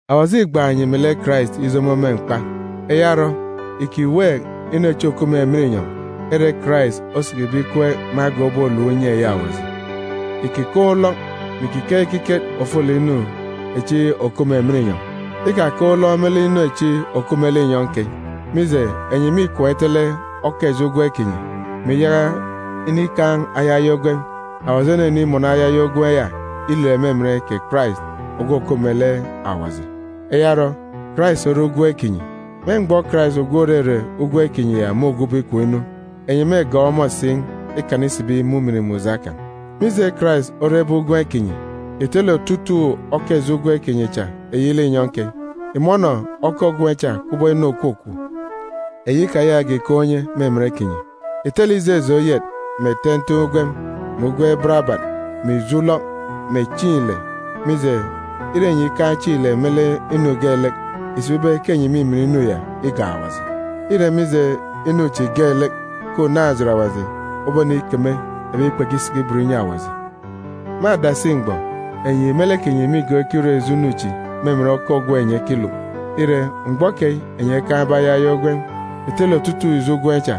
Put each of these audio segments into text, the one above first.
Awaji îgbaan̄ enyi melek Karais ijomo me mkpa. Eya orọ, ìkiweek inu echi òkup me emen inyọn̄ ere Karais osikibe ikweek me agan̄ ubọk ulom unye eyi Awaji. Ìkikaan̄ ulọk, mè ìkikeek ekiket ofolek inu echi òkup me emen inyọn̄, ikakaan̄ ulọk me lek inu echi òkup me linyọn̄ keyi. Mije, enyi mîkwaan̄ itele oka ijo ugwem kinyi, mè iyaka inikaan̄ ayaya ugwem. Awaji onenimọnọ ayaya ugwem ya ilet me emen kè Karais, ogwu òkup melek Awaji. Eya orọ, Karais ore ugwem kinyi. Me mgbọ Karais, ogwu òrere ugwem kinyi ya, môgwube ikom inu, enyi mêgọọk ọmọ si ikana isibi me ujamgbugbo kan̄. Mije Karais orebe ugwem kinyi, ìtele otutuuk oka ijo ugwem kinyi cha eyi linyọn̄ keyi. Ìmọnọ oka ugwem cha kubọk inu òkwukwu, eyi ikayakage ìkaan̄ unye me emen kinyi. Ìtele ijeje oyet mè ten̄ten̄ ugwem, mè ugwem barabat, mè ijo ulọk, mè chieen̄ ile, mije, ire enyi ikaan̄ chieen̄ ile me lek inu geelek, ìsibi ibe ke enyi mîmin inu ya igak Awaji. Îre mije inu chi geelek ke unaan̄-ejit Awaji obonikeme ebi kpekisiki ibot inyi Awaji. Me adasi mgbọ, enyi me lek kinyi mîgọọk ikirọ ijo inu chi me emen oka ugwem enyi ekiluk. Ire, mgbọ keyi enyi ekaan̄be ayaya ugwem, ìtele otutuuk ijo ugwem cha.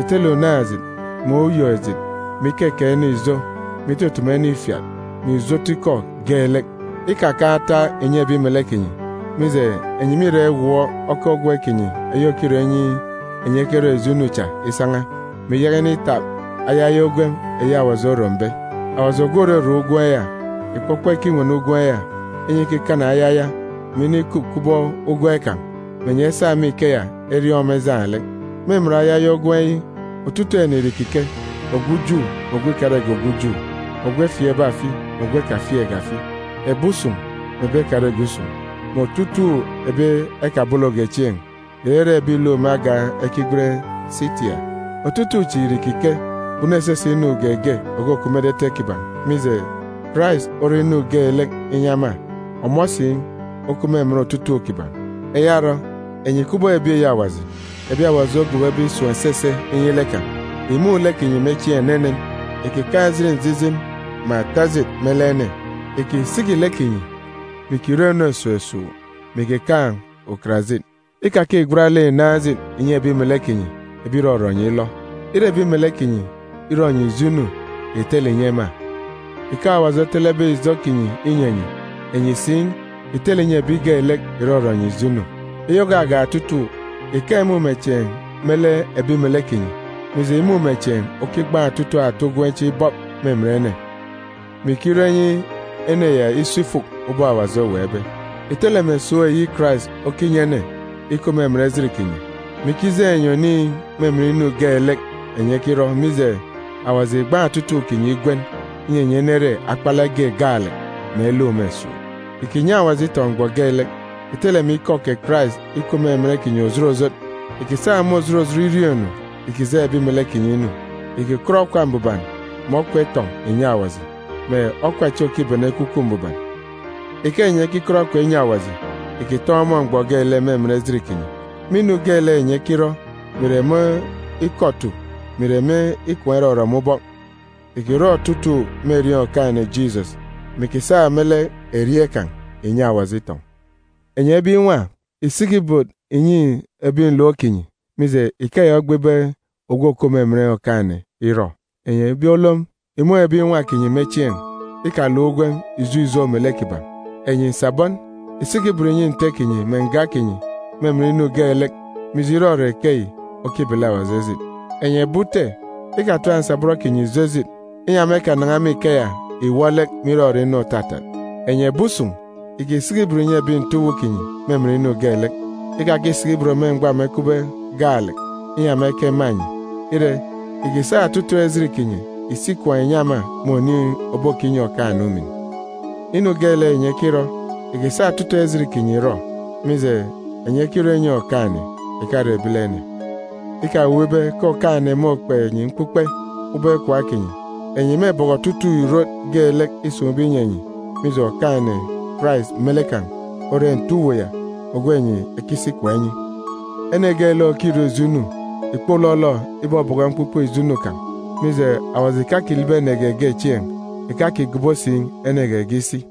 Ìtele unaan̄-ejit, mè uyok-ejit, mè ikekeek ene ijo, mè itutumu ene ifiat, mè ijo otu ikọ geelek. Ikakan̄ ataak ìnyi ebi melek kinyi, mije, enyi mîra iwọọk oka ugwem kinyi eyi òkirọ inyi enyi ekerọ ijo inu cha isan̄a, mè iyaka initap ayaya ugwem eyi Awaji orombe. Awaji ogwu òrorom ugwem ya ìkpọkpọ ikinwene ugwem ya, inyi ikikana ayaya, mè inikup kubọk ugwem kan̄, mè enyi esa me ikeya eriọọn̄ ọmọ ejaan̄ lek. Me emen ayaya ugwem yi, otutuuk ene ìre ìkike, ogwu Ju mè ogwu ikarege ogwu Ju, ogwu efieekbe afi mè ogwu ekafieekge afi, ebi usun̄ mè ebi ekarege usun̄, mè otutuuk ebi ekabologe chieen̄, ìrere ebi ìluk me agan̄ ekigwen Sitia. Otutuuk ife chi ìre ìkike, kpunu esese inu geege òkukup me etete kiban̄, mije, Karais ore inu geelek inyi ema, ọmọ si okup me emen otutuuk kiban̄. Eya orọ, enyi kubọk ebi eyi Awaji, ebi Awaji ogobobe isun̄ esese inyi lek kan̄, ìmun̄ lek kinyi me chieen̄ enenen, ìkikaan̄ njijin mè ata ejit me lek ene. Ìkisiki lek kinyi, mè ìkirọ inu esuuk esuuk, mè ìkikaan̄ ukarajit. Ikakigwat lek ìnaan̄ ejit ìnyi ebi melek kinyi ebi ìrọrọ enyi ilọ. Ire ebi melek kinyi irọ enyi ijo inu, ìtele inyi ema. Ike Awaji otelebe ijo kinyi inyi enyi, enyi si, ìtele ìnyi ebi geelek ìrọrọ enyi ijo inu. Eyi ògagak otutuuk, ìkaan̄ imumechieen̄ me lek ebi melek kinyi, mije, imumechieen̄ okigbaan̄ otutuuk ata ugwem chi ibọp me emen ene, mè ikirọ inyi ene ya iso ifuk ubọk Awaji oweekbe. Ìtele mè esuuk eyi Karais okinyi ene ikup me emen ejit kinyi, mè ikijeen̄ enyi oniin̄ me emen inu geelek enyi ekirọ, mije, Awaji ìgbaan̄ otutuuk kinyi igwen, inyi enyi enere akpalek ge gaalek, mè eluk me esuuk. Ìkinyi Awaji itọn̄ mgbọ geelek. Ìtele mè ikọ kè Karais ikup me emen kinyi òjot òjot. Ìkisa me òjot òjot iriọọn̄-inu ìkijeen̄ ebi melek kinyi inu. Ìkikọt okwa mbuban mè okwa itọn̄ ìnyi Awaji, mè okwa echi òkibene Ekwukwu Mbuban. Ike enyi ekikọt okwa inyi Awaji, ìkitọn̄ ọmọ mgbọ geelek me emen ejit kinyi. Me inu geelek enyi ekirọ, mè ìre me ikọ otu mè ìre me ikwaan̄ irọrọ me ubọk, ìkirọ otutuuk me erieen̄ Okaan̄-ene Jisọs, mè ìkisa me lek erieen̄ kan̄ ìnyi Awaji itọn̄. Enyi ebi nwa, ìsiki ibot ìnyi ebi nlom kinyi, mije, ikeya ogbe ibe ogwu òkup me emen Okaan̄-ene irọ. Enyi ebi olom, ìmun̄ ebi nwa kinyi me chieen̄. Ikaluk ugwem ijo ijo melek kiban̄. Enyi nsabọn, ìsiki ibot ìnyi nte kinyi mè nga kinyi me emen inu geelek, mije, irọrọ ikeyi okibele Awaji ejit. Enyi ebi ute, ikatap nsabọn kinyi ijo ejit, inyi ema ekanan̄a me ikeya ìwọ lek me irọrọ inu òtatat. Enyi ebi usun̄, ìkisiki ibot ìnyi ebi nte uwu kinyi me emen inu geelek. Ikakisiki ibot me mgbọ ema ekupbe gaalek, inyi ema ekema enyi. Ire, ìkisa otutuuk ejit kinyi ìsi ikwaan̄ ìnyi ema me oniin̄ òbokinyi Okaan̄-ene umin. Inu geelek enyi ekirọ, ìkisa otutuuk ejit kinyi ìrọ, mije, enyi ekirọ inyi Okaan̄-ene, ìkare ebilene. Ikawuuk ibe ke Okaan̄-ene môkpe enyi mkpukpe ubọk ikwaan̄ kinyi. Enyi mêbọkọ otutuuk ìrot geelek îsun̄be inyi enyi, mije, Okaan̄-ene Karais me lek kan̄ ore nte uwu ya ogwu enyi ekisi ikwaan̄ inyi. Ene geelek òkirọ ijo inu ìkpolọlọ ibọbọkọ mkpukpe ijo inu kan̄, mije, Awaji ìkakilibi ene geege chieen̄, ìkakigobo si ene geege isi.